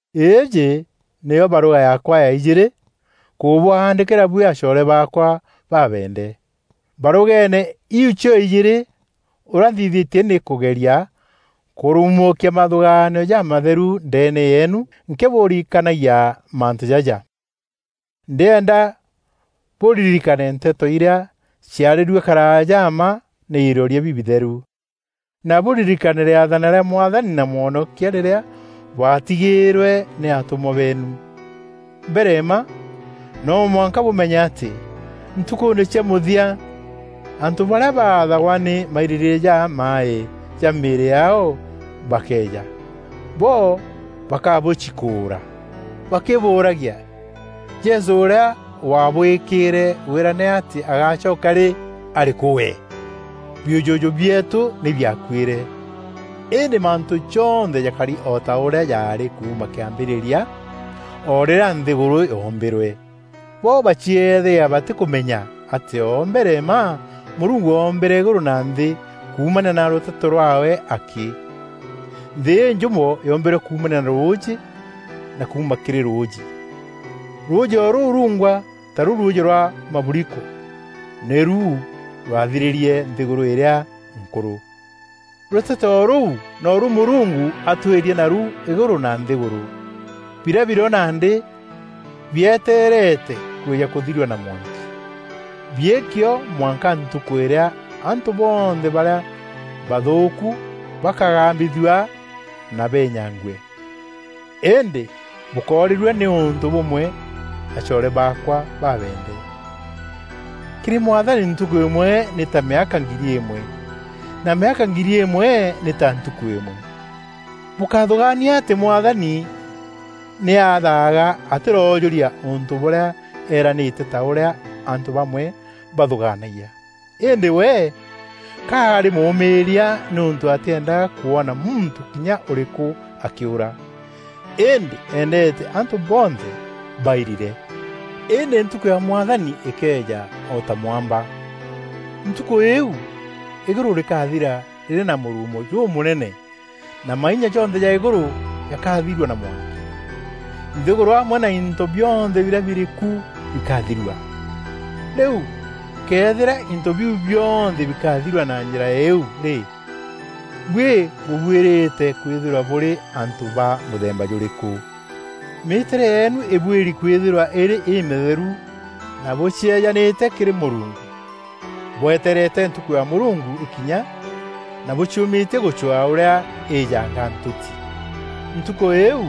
Îîjî nîyo barûga yaakwa ya ijîîrî kûbwandîkîra buî acoore baakwa babeende. Barûgeene iu cio-ijîîrî, ûrîa nthîthîtie nî kûgeria kûruumûkia mathûgaanio jamatheru ndeene yeenu nkîbûrikanagia mantû jaja. Ndîenda bûririkane nteto irîa ciarîrue karaaja mma nî iroria bibitheru, na bûririkane rîathana rîa Mwathani na Mwonokia rîrîa bwaatigîîrwe nî atûmwa beenu. Mbere mma, no mwanka bûmenye atî ntukûûne cia mûthia, antû barîa baathagwa nî mairîrîîria jamaaî ja mîîrî yaao bakeeja. Bo bakabûcikûûra bakîbûûragia, “Jesû ûrîa waabwîkîîre wîrane atî agacoka rî, arîkû we? Biûjûjû bieetû nî biakuîre, îndî mantû jonthe jakari o ta ûrîa jaarî kuuma kîambîrîria o rîrîa nthîgûrû yoombîrwe!” Bo bacieethagia batîkûmenya atî o mbere mma Mûrungu oombîre îgûrû na nthî kuumania na rûteto rwaawe akî. Nthî înjûmo yoombîrwe kuumania na rûûjî na kuuma kîrî rûûjî, rûûjî o rûu rungwa, taru rûûjî rwa maburiko, nîru rwathirîrie nthîgûrû îrîa nkûrû. Rûteto o rûu noru Mûrungu atwîîrie naru îgûrû na nthîgûrû, birîa birîo nandî bietereete kwîja kûthirua na mwanki. Biîki o mwanka ntukû îrîa antû bonthe barîa bathûûku bakagambithûa na beenyangue. Îndî bûkórîrua nî ûntû bûmwe acoore baakwa babeende! Kîrî Mwathani ntukû îmwe nî ta mîaka ngiri îmwe na mîaka ngiri îmwe nî ta ntukû îmwe. Bûkáthûgaania atî Mwathani nî athaaga atîroojûria ûntû bûrîa eranîîrîte ta ûrîa antû bamwe bathûgaanagia. Îndî we ka arî mûûmîîria nîûntû atîendaga kwona muntû kinya ûrîkû akîûra, îndî eendeete antû bonthe bairire. Îndî ntukû ya Mwathani îkeeja o ta mwamba. Ntukû îîu, îgûrû rîkathira rîrî na mûruumo jûmûnene na mainya jonthe ja îgûrû jakathirua na mwanki. Nthîgûrû amwe na into bionthe birîa birî ku bikathirua. Rîu, këethîra into biu bionthe bikathirua na njîra îîu rî, buî bûbuîrîte kwîthîrwa bûrî antû ba mûthemba jûrîkû? Mîîtîre yeenu îbuîri kwîthîrwa îrî îmîtheru na bûcieejanîte kîrî Mûrungu, bwetereete Ntukû ya Mûrungu îkinya na bûciûmîtie gûcwaa ûrîa îîjanga ntûti. Ntukû îîu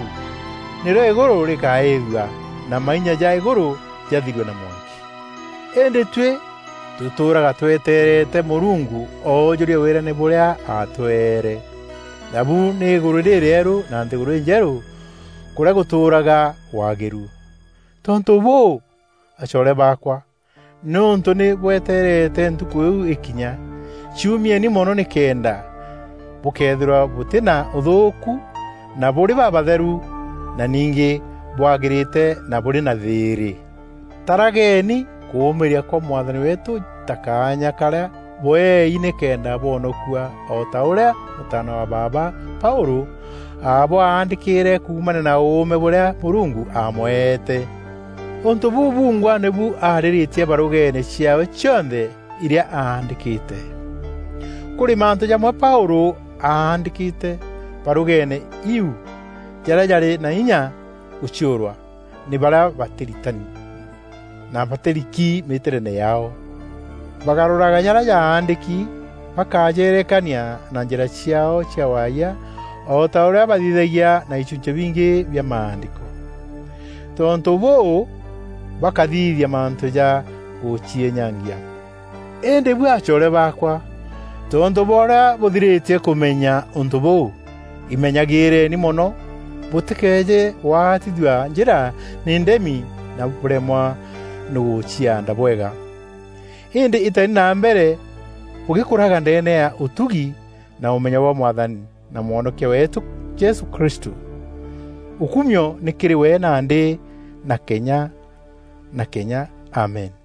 nîrîo Îgûrû rîkaîîthua na mainya ja îgûrû jathirue na mwanki. Îndî tuî tûtûûraga twetereete Mûrungu oojûria wîrane bûrîa atweere; nabu nî Îgûrû rîrîeru na nthîgûrû înjerû kûrîa gûtûûraga waagîru. Tontû bûû, acoore baakwa, nîûntû nî bweteerete Ntukû îîu îkinya, ciûmieni mono nîkenda bûkeethîrwa bûtî na ûthûûku na bûrî babatheru na ningî bwagîrîte na bûrî na thîîrî. Tarageeni kûûmîîria kwa Mwathani weetû ta kaanya karîa bweei nîkenda bwonokua o ta ûrîa mûtaana wa baaba Paûlû abwaandîkîîre kuumania na ûûme bûrîa Mûrungu amweete. Ûntû bûu bungwa nîbu arîrîtie barûgeene ciaawe cionthe irîa aandîkîte. Kûrî mantû jamwe Paûlû aandîkîte barûgeene iu jarîa jarî na inya gûciûrwa nî barîa batîritani na batîriki mîtîreene yaao. Bagarûraga jarîa jaandîki bakajeerekania na njîra ciaao cia waayia o ta ûrîa bathithagia na ichunchî bingî bia Maandîko. Tontû bûû, bakathithia mantû ja gûciînyangia. Îndî buî acoore baakwa tontû bwa ûrîa bûthirîtie kûmenya ûntû bûu, imenyagîîreni mono bûtîkeeje gwaatithua njîra nî ndemi na bûremwa nî gûciaanda bwega. Îndî îteni na mbere bûgîkûraga ndeene ya ûtugi na ûmenyo bwa Mwathani na Mwonokia weetû Jesû Kristû. Ûkumio nî kîrî we nandî na kenya na kenya! Amen.